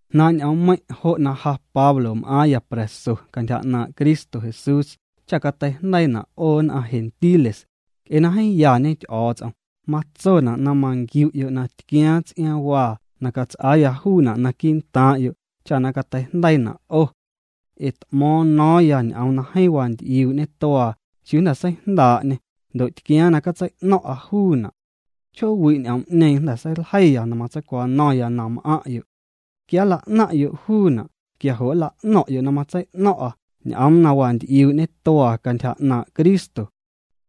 Jnaaⁿ' ñ'oommeiⁿ', jo' na ja Pablo m'aaⁿya pra̱so cantyja 'naaⁿ' Cristo Jesús cha cateijndeiina' 'o nn'aⁿ gentiles, Nc'e na jeeⁿ yañe Ty'o̱o̱ts'om, matsona' na manquiu'yo' na tquiaaⁿ ts'iaaⁿwaa na cats'aaya juuna' naquii'ntaaⁿ'yo' cha na cateijndeiina' 'o. Ee t'mo̱o̱ⁿ no̱o̱ⁿya ñ'oom na jeeⁿ wanty'iuu' ñetuaa chiuu jnda̱ seijndaa'ñê, ndo' tquiaaⁿ na catsei'no̱ⁿ'a juuna'. Chjoowi' ñ'oom'ñeeⁿ jnda̱ seiljeiya na matseicwano̱ⁿya na m'aⁿ'yo'. Quia nla'naⁿ'yo' juuna' quia jo' nla'no̱ⁿ'yo' na matsei'no̱ⁿ'a ñ'oom na wanty'iuu' ñetuaa cantyja 'naaⁿ' Cristo.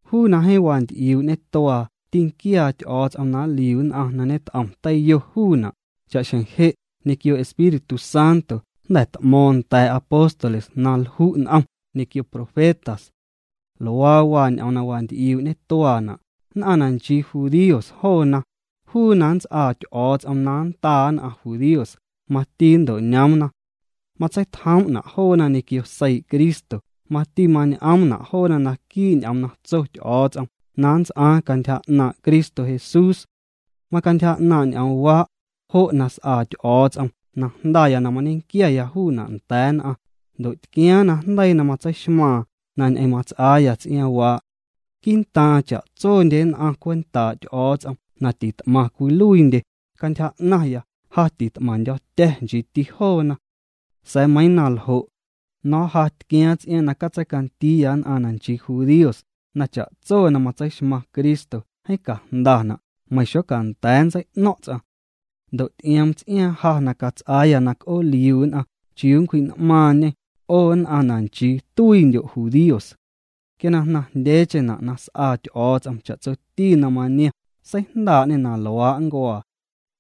Juu na jeeⁿ wanty'iuu' ñetuaa tînquiaa Ty'o̱o̱ts'om na nliu nn'aⁿ na ñet'om teiyo juuna', cha'xjeⁿ je' ñequio Espíritu Santo jnda̱ t'mo̱o̱ⁿ nda̱a̱ apóstoles na lju' n'om ñequio profetas. Luaa waa ñ'oom na wanty'iuu' ñetuaana': Nn'aⁿ na nchii judíos joona, juu na nnts'aa Ty'o̱o̱ts'om na nndaa nn'aⁿ judíos, mati nnto'ñoomna. Matseitjoom'na' joona ñequio seii' Cristo, mati mañ'oomna' joona naquii' ñ'oom na tso Ty'o̱o̱ts'om na nnts'aaⁿ cantyja 'naaⁿ' Cristo Jesús. Macantyja 'naaⁿ' ñ'oomwaa' jo' na s'aa Ty'o̱o̱ts'om na jndaya na mañequiaya juuna' nda̱a̱ nn'aⁿ, ndo' tquiaaⁿ najndeii na matseixmaaⁿ na ñ'eⁿ mats'aaya tsiaaⁿwaa'. Quii'ntaaⁿ cha'tsondye nn'aⁿ cwentaa' Ty'o̱o̱ts'om na tit'maⁿ cwiluiindye, cantyja 'naⁿya, ja tit'maⁿndyo̱tya̱, nchiiti joona. Sa̱a̱ meiiⁿ na ljo', no̱o̱ⁿ ja tquiaaⁿ ts'iaaⁿ na catseicandiiya nn'aⁿ na nchii judíos na cha'tso na matseixmaⁿ Cristo jeeⁿ cajndana' meiⁿ xocanda̱a̱ nntsei'no̱ⁿ' ts'aⁿ. Ndo' ty'ioom ts'iaaⁿ ja na cats'aaya na c'ooliu nn'aⁿ chiuu nncwji'n'maaⁿñê 'o nn'aⁿ na nchii tuiindyo' judíos. Quia na jnaⁿjndyeecheⁿna' na s'aa Ty'o̱o̱ts'om cha'tsoti na maniom seijndaa'ñê na luaa' nncuaa,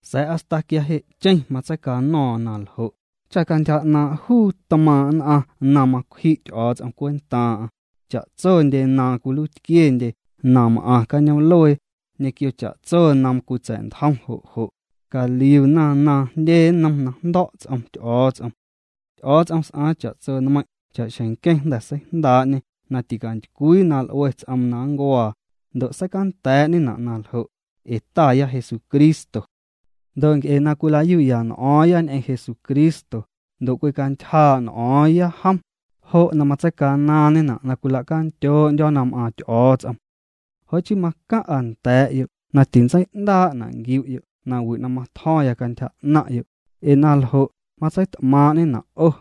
sa̱a̱ hasta quia je'cheⁿ matseicano̱o̱ⁿ na ljo', cha cantyja 'naaⁿ' juu tmaaⁿ' nn'aⁿ na macwji' Ty'o̱o̱ts'om cwentaaⁿ'aⁿ cha'tsondye na cwiluiitquiendye na m'aⁿ cañoom'luee ñequio cha'tso na cwitsa̱'ntjom jo' jo', caliuna na jndye nnom na jndo̱' ts'om Ty'o̱o̱ts'om. Ty'o̱o̱ts'om s'aaⁿ cha'tso nmeiⁿ' cha'xjeⁿ nqueⁿ jnda̱ seijndaa'ñê na ticantycwii na l'ue ts'oom na nncuaa, ndo' seicanda̱a̱'ñena' naljo' ee Taya Jesucristo. Ndo' nc'e na cwila'yu'ya n'o̱o̱ⁿ ñ'eⁿ Jesucristo ndo' cwicantyjaa' n'o̱o̱ⁿya jom, jo' na matseicanaaⁿñena' na cwila'candyoo'ndyo̱ na m'aaⁿ Ty'o̱o̱ts'om. Jo' chii macaⁿ'a nda̱a̱'yo' na tintsei'ndaa'na' nquiu'yo' nawi' na matjo̱ⁿya cantyja 'naⁿ'yo' ee na ljo', matseit'maaⁿ'ñena' 'o.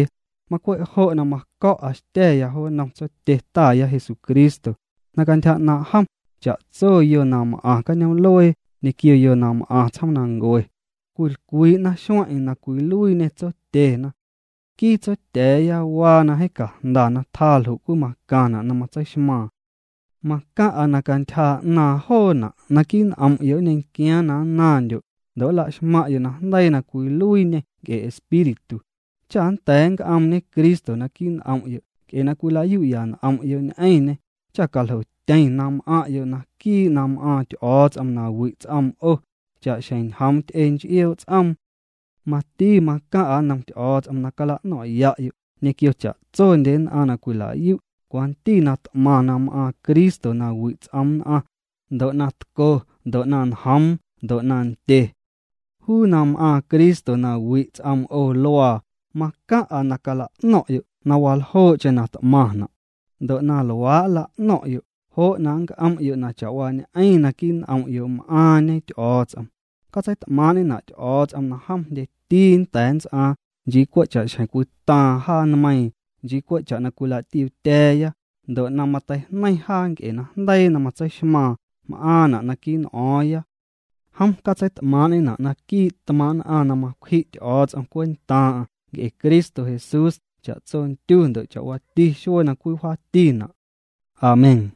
Macwe' jo' na maco̱'a xtya̱ya jo nnom Tsotye Taya Jesucristo, na cantyja 'naaⁿ' jom cha'tso yo na m'aⁿ cañoom'luee ñequio yo na m'aⁿ tsjoomnancue, cwilcwii'na xueⁿ'eⁿ na cwiluiiñê Tsotyena. Nquii Tsotya̱a̱ya waa na jeeⁿ cajnda na tjaa ljo' cwii macaⁿna' na matseixmaaⁿ. Macaⁿ'a na cantyja 'naaⁿ joona', naquii' n'om'yo' nñequiaaⁿ na nnaⁿndyo' ndo' nla'xmaⁿ'yo' najndeii na cwiluiiñê nc'e Espíritu, cha nnda̱a̱ nnc'oomñe Cristo naquii' n'om'yo' nc'e na cwila'yu'ya n'om'yo' ñ'eⁿñê cha caljotyeⁿ na m'aⁿ'yo' naquii' na m'aaⁿ Ty'o̱o̱ts'om na wi' ts'om 'o, cha'xjeⁿ njoom ty'e nch'ioo' ts'oom. Mati macaⁿ'a nnom Ty'o̱o̱ts'om na cala'no̱ⁿ'ya'yo' ñequio cha'tsondye nn'aⁿ na cwila'yu' cwanti na t'maⁿ na m'aaⁿ Cristo na wi' ts'oom nn'aⁿ, ndo' na tco, ndo' na njoom, ndo' na ndye. Juu na m'aaⁿ Cristo na wi' ts'oom 'o luaa, macaⁿ'a na cala'no̱ⁿ'yo' na waljoo'cheⁿ na t'maⁿna', ndo' na luaa' nla'no̱ⁿ'yo' jo' na nnc'om'yo' na chawaañ'eⁿ naquii' n'om'yo' m'aaⁿñe Ty'o̱o̱ts'om. Catseit'maaⁿ'ñena' Ty'o̱o̱ts'om na jom jndyeti nnda̱a̱ nnts'aaⁿ nchii cwe' cha'xjeⁿ cwitaaⁿ jaa meiⁿ nchii cwe' cha na cwila'tiuutya̱a̱ya ndo' na mateijneiⁿ jaa nc'e najndeii na matseixmaaⁿ m'aaⁿna' naquii' n'o̱o̱ⁿya. Jom catseit'maaⁿ'ñena' naquii' tmaaⁿ' nn'aⁿ na macwji' Ty'o̱o̱ts'om cwentaaⁿ'aⁿ nc'e Cristo Jesús cha'tso ndyu ndo' cha'waati xuee na cwii wjaatina'. Amén.